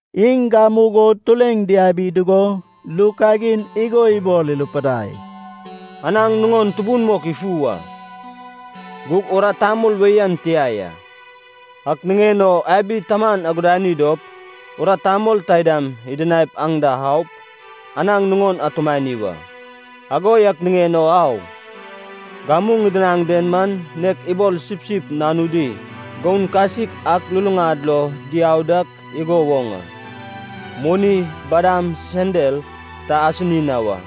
Iŋ gamugo tureŋ diabi dugo, ru kagin igo ibol irupidai, “Anaŋ nuŋon tubun mok ifu a. Gug urat tamol wei an tia ya. Ak niŋen o abi taman aguduani dop urat tamol taidam idinaip aŋ da aup, anaŋ nuŋon atumani wa. Ago yak niŋen o au. Gamu ŋidinaŋ den man nek ibol sipsip nanudi goun kasik ak luluŋad lo diau dak igo woŋ a. Moni, badam, sendal ta asini na wa.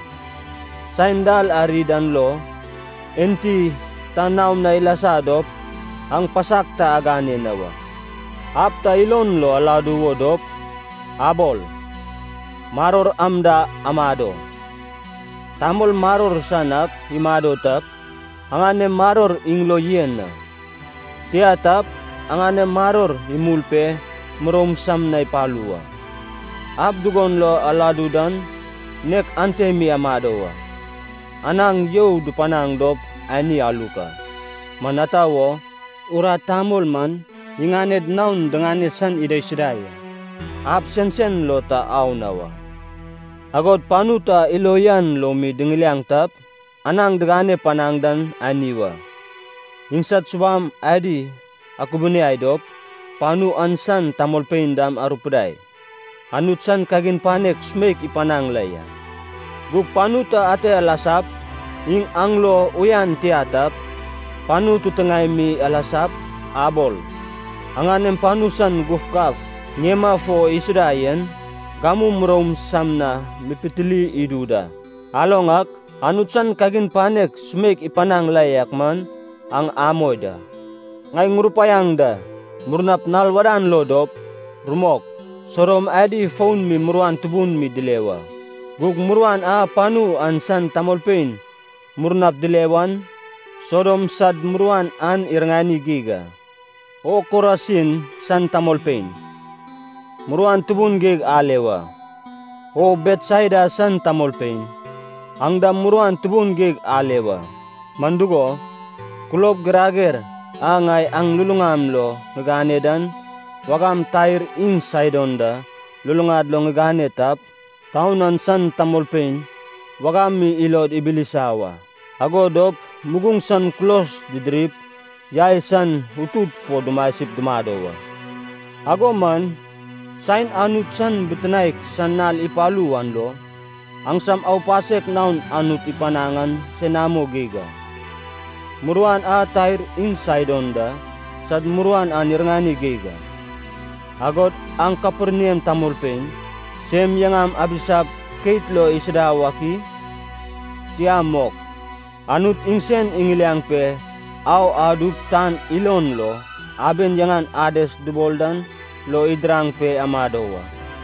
Saen dal ari dan lo, enti ta naom na ilasa dop aŋ pasak ta agane na wa.” “Ab ta ilon lo aladu wo dop, abol, ‘Maror am da amado.’ Tamol maror san ak imado tap, aŋanem maror iŋ lo yen a. Tia tap, aŋanem maror imul pe muroum sam na ipalu wa. Ab dugon lo aladu dan, nek ante mi amado wa. Anaŋ you dupanaŋ dop ani aluk a. Man ata wo, urat tamol man iŋaned naon diŋane san idaisuda ya. Ab sensen lo ta au na wa. “Agod panu ta ilo uyan lo mi diŋiliaŋ tap, anaŋ digane panaŋ dan ani wa. Iŋsad subam adi akubuniai dop, panu an san tamolpein dam arupidai, ‘Anut san kagin panek sumeik ipanaŋ la ya.’ Gug panu ta ate alasap, iŋ aŋ lo uyan tia tap, panu titiŋaem mi alasap, abol, ‘Aŋanem panu san gufgaf ŋiema fo isuda yen, gamu muroum sam na mipitili idu da. Aloŋ ak, Anut san kagin panek sumeik ipanaŋ la yak man aŋ amoi da.’ Ŋai ŋurupaiaŋ da, murnap nal wadan lo dop, rumok, Sodom adi fon mi muruan tubun mi dile wa. Gug muruan a panu an san tamolpein murnap dile wan, Sodom sad muruan an iriŋani geig a.” “O Korasin san tamolpein, muruan tubun geig ale wa; O Betsaida san tamolpein, aŋ dam muruan tubun geig ale wa. Man dugo, kulob girager a ŋai aŋ luluŋam lo ŋigane dan, wagam Tair iŋ Saidon da luluŋad lo ŋigane tap, taun an san tamolpein wagam mi ilod ibilisa wa. Ago dop muguŋ san kulos didirip, yai san utut fo dumasip dumado wa. Ago man saen Anut san bitinaek san nal ipalu wan lo, aŋsam aupasek naon Anut ipanaŋ an senamo geig a. Muruan an Tair iŋ Saidon da sad muruan an iriŋani geig a. Agod aŋ Kaperniam tamolpein, sem yaŋam abisap keit lo isuda wak i? Tia mok, Anut iŋsen iŋiliaŋ pe au adup tan ilon lo aben yaŋan Ades dubol dan lo idiraŋ pe amado wa.”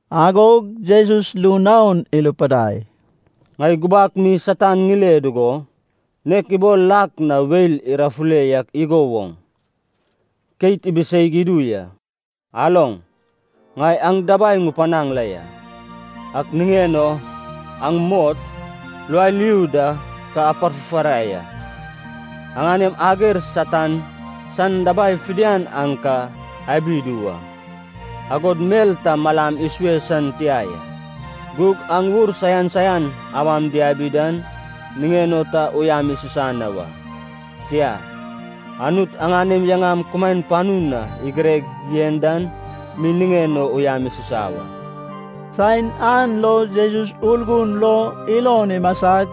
Agog Jesus ru naon irupidai, “Ŋai gubak mi Satan ŋile dugo, nek ibol lak na weil irafule yak igo woŋ, keit ibiseig idu ya. Aloŋ, ŋai aŋ dabai ŋupanaŋ la ya. Ak niŋen o aŋ mot, lualiu da ka aparfufarai a. Aŋanem ager Satan san dabai fidian aŋ ka abi idu wa, agod mel ta malam isue san tia ya. Gug aŋ ur saian saian awam diabi dan niŋen o ta uyam isusa na wa. Tia. Anut aŋanem yaŋam kumaen panu na igireg yen dan mi niŋen o uyam isusa wa.” Saen an lo Jesus Urgun lo ilon imasag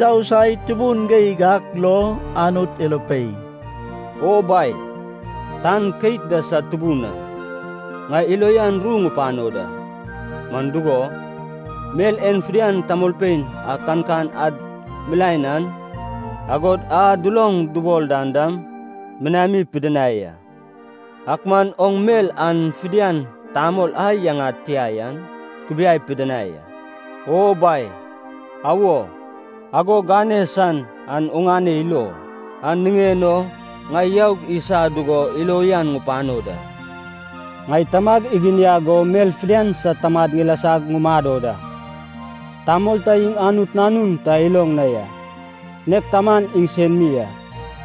yousai tubun geig ak lo Anut irupei, “O Bai, tan keit da sad Tubun a, ŋai ilo uyan ru ŋupano da. Man dugo, mel en fidian tamolpein a kankan ad milaen an, agod a duloŋ dubol dan dam, minami pidinai a. Ak man oŋ mel an fidian tamol a yaŋad tia yan kubiai pidinai a. O Bai, awo, ago gane san an oŋane ilo, an niŋen o ŋai youg isa dugo ilo uyan ŋupano da.” “Ŋai Tamag iginiag go mel fidian sad tamad ŋilasag ŋumado da. Tamol ta iŋ Anut Nanun ta iloŋ na ya, nek Taman iŋsen mi a.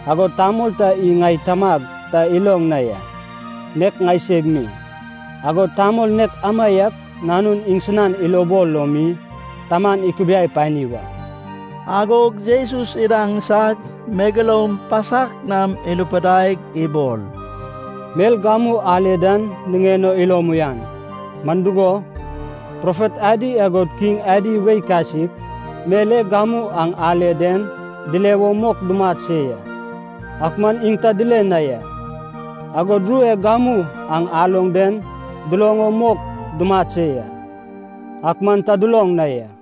Agod tamol ta iŋ ŋai Tamag ta iloŋ na ya, nek ŋaiseg mi, agod tamol nek amaiak Nanun iŋsinan ilobol lo mi Taman ikubiai pani wa.” Agog Jesus idaŋsag, megeloum pasak nam irupidaig ibol, “Mel gamu ale dan niŋen o ilom uyan. Man dugo, profet adi agod kiŋ adi wei kasik, mel e gamu aŋ ale den dile wo mok dumat se ya, ak man iŋ ta dile na ya. Agod ru e gamu aŋ aloŋ den duloŋ o mok dumat se ya, ak man ta duloŋ na ya.”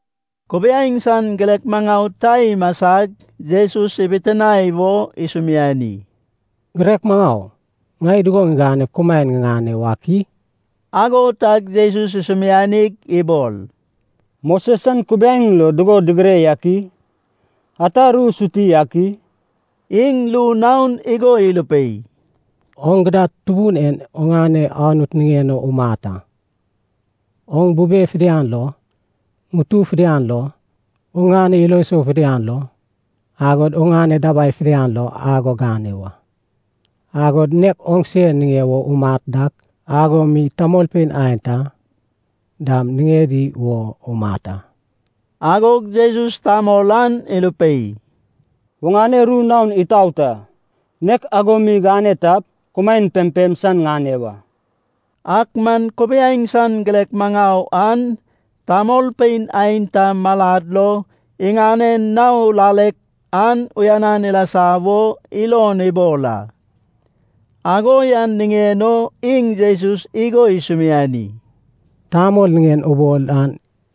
Kubiaeŋ san girek maŋau ta imasag Jesus ibitinae wo isumiani, “Girek maŋau, ŋai dugo ŋiganep kumaen ŋiŋane wak i?” Ago tag Jesus isumianig ibol, “Moses san kubiaeŋ lo dugo digire yak i? Ata ru suti ak i?” Iŋ ru naon igo irupei, “Oŋ gidad Tubun en oŋane Anut niŋen o umat a, oŋ bube fidian lo, ŋutu fidian lo, oŋane ilo sou fidian lo, agod oŋane dabai fidian lo ago gane wa. Agod, nek oŋse niŋe wo umat dak ago mi tamolpein aenta dam niŋedi wo umat a.” Agog Jesus tamol an irupei, “Oŋane ru naon itaot a. Nek ago mi gane tap, kumaen pempem san ŋane wa.” Ak man kubiaeŋ san girek maŋau an, tamolpein aenta malad lo iŋanen nao lalek an uyanan ilasa wo ilon ibol a. Ago yan niŋen o iŋ Jesus igo isumiani, “Tamol niŋen ubol an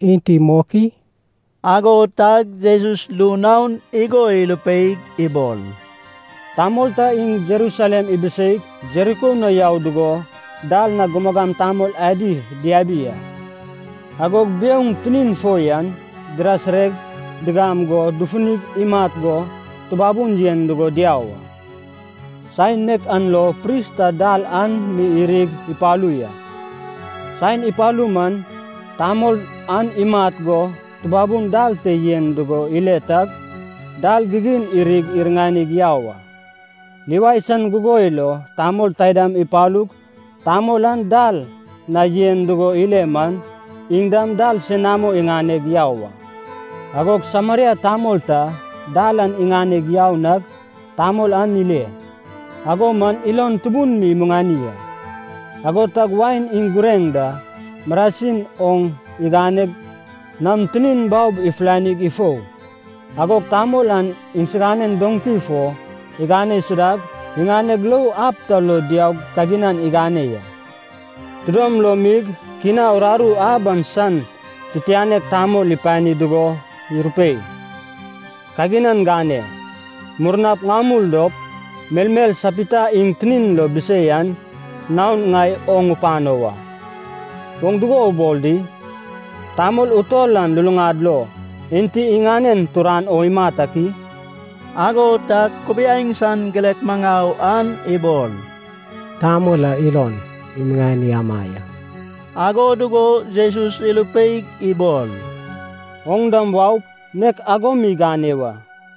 enti mok i?” Ago tag Jesus ru naon igo irupeig ibol, “Tamol ta iŋ Jerusalem ibiseig Jeriko na yau dugo dal na gumagam tamol adi diabi a. Agog biouŋ tinin fo yan dirasireg digam go, dufunig imat go tubabun yen dugo diau a. Saen nek an lo pris ta dal an mi irig ipalu ya. Saen ipalu man tamol an imat go tubabun dal te yen dugo ile tag, dal gigin irig iriŋanig yau a. Livai san gugoi lo tamol taidam ipalug tamol an dal na yen dugo ile man, iŋ dam dal senamo iŋaneg yau a. Agog Sameria tamol ta dal an iŋaneg yau nag tamol an ile, ago man ilon tubun mi imuŋani a. Ago tag wain iŋ gureŋ da marasin oŋ iŋaneg nam tinin baob ifulanig ifou. Agog tamol an iŋsiganen doŋki fo igane isudag, iŋaneg lou ab ta lo diaug kaginan igane ya. Tidom lom mig kina uraru ab an san titianek tamol ipani dugo irupei, ‘Kaginan gane. Murnap ŋamul dop, melmel sapita iŋ tinin lo bisei an naon ŋai oŋ ŋupano wa.’” “Oŋ dugo ubol di? Tamol utol an luluŋad lo enti iŋanen turan o imat ak i?” Ago tag kubiaeŋ san girek maŋau an ibol, “Tamol a ilon imuŋani ama ya.” Ago dugo Jesus irupeig ibol, “Oŋ dam waup, nek ago mi gane wa.”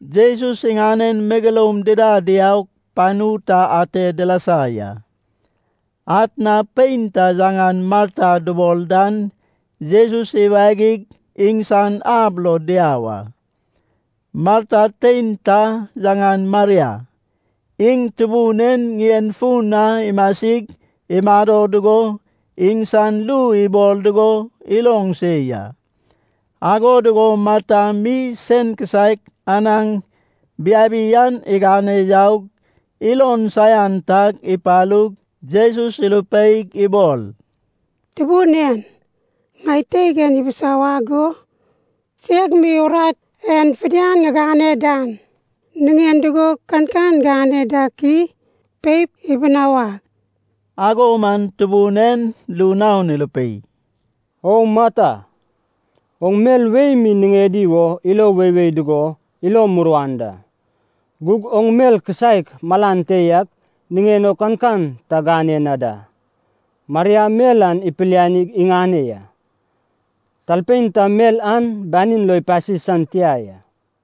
Jesus iŋanen megeloum dida diaug panu ta ate dilasa ya. Atna pein ta yaŋan Marta dubol dan Jesus iwagig iŋsan ab lo diau a. Marta tein ta yaŋan Maria, iŋ Tubun en ŋien fun na imasig imado dugo, iŋsan ru ibol dugo iloŋ se ya. Ago dugo Marta mi sen kisaek anaŋ biabi an iganeg yaug, ilon saian tag ipalug Jesus irupeig ibol, “Tubun en. Ŋai teig en ibisawag go seg mi urat en fidian ŋigane dan niŋen dugo kankan gane dak i? Peip, ibunawag.” Ago man Tubun en ru naon irupei, “O Marta! Oŋ mel wei mi niŋedi wo ilo weiwei dugo ilo muruan da. Gug oŋ mel kisaek malan te yak niŋen o kankan ta gane na da. Maria mel an ipilianig iŋane ya. Talpein ta mel an banin lo ipasi san tia ya.”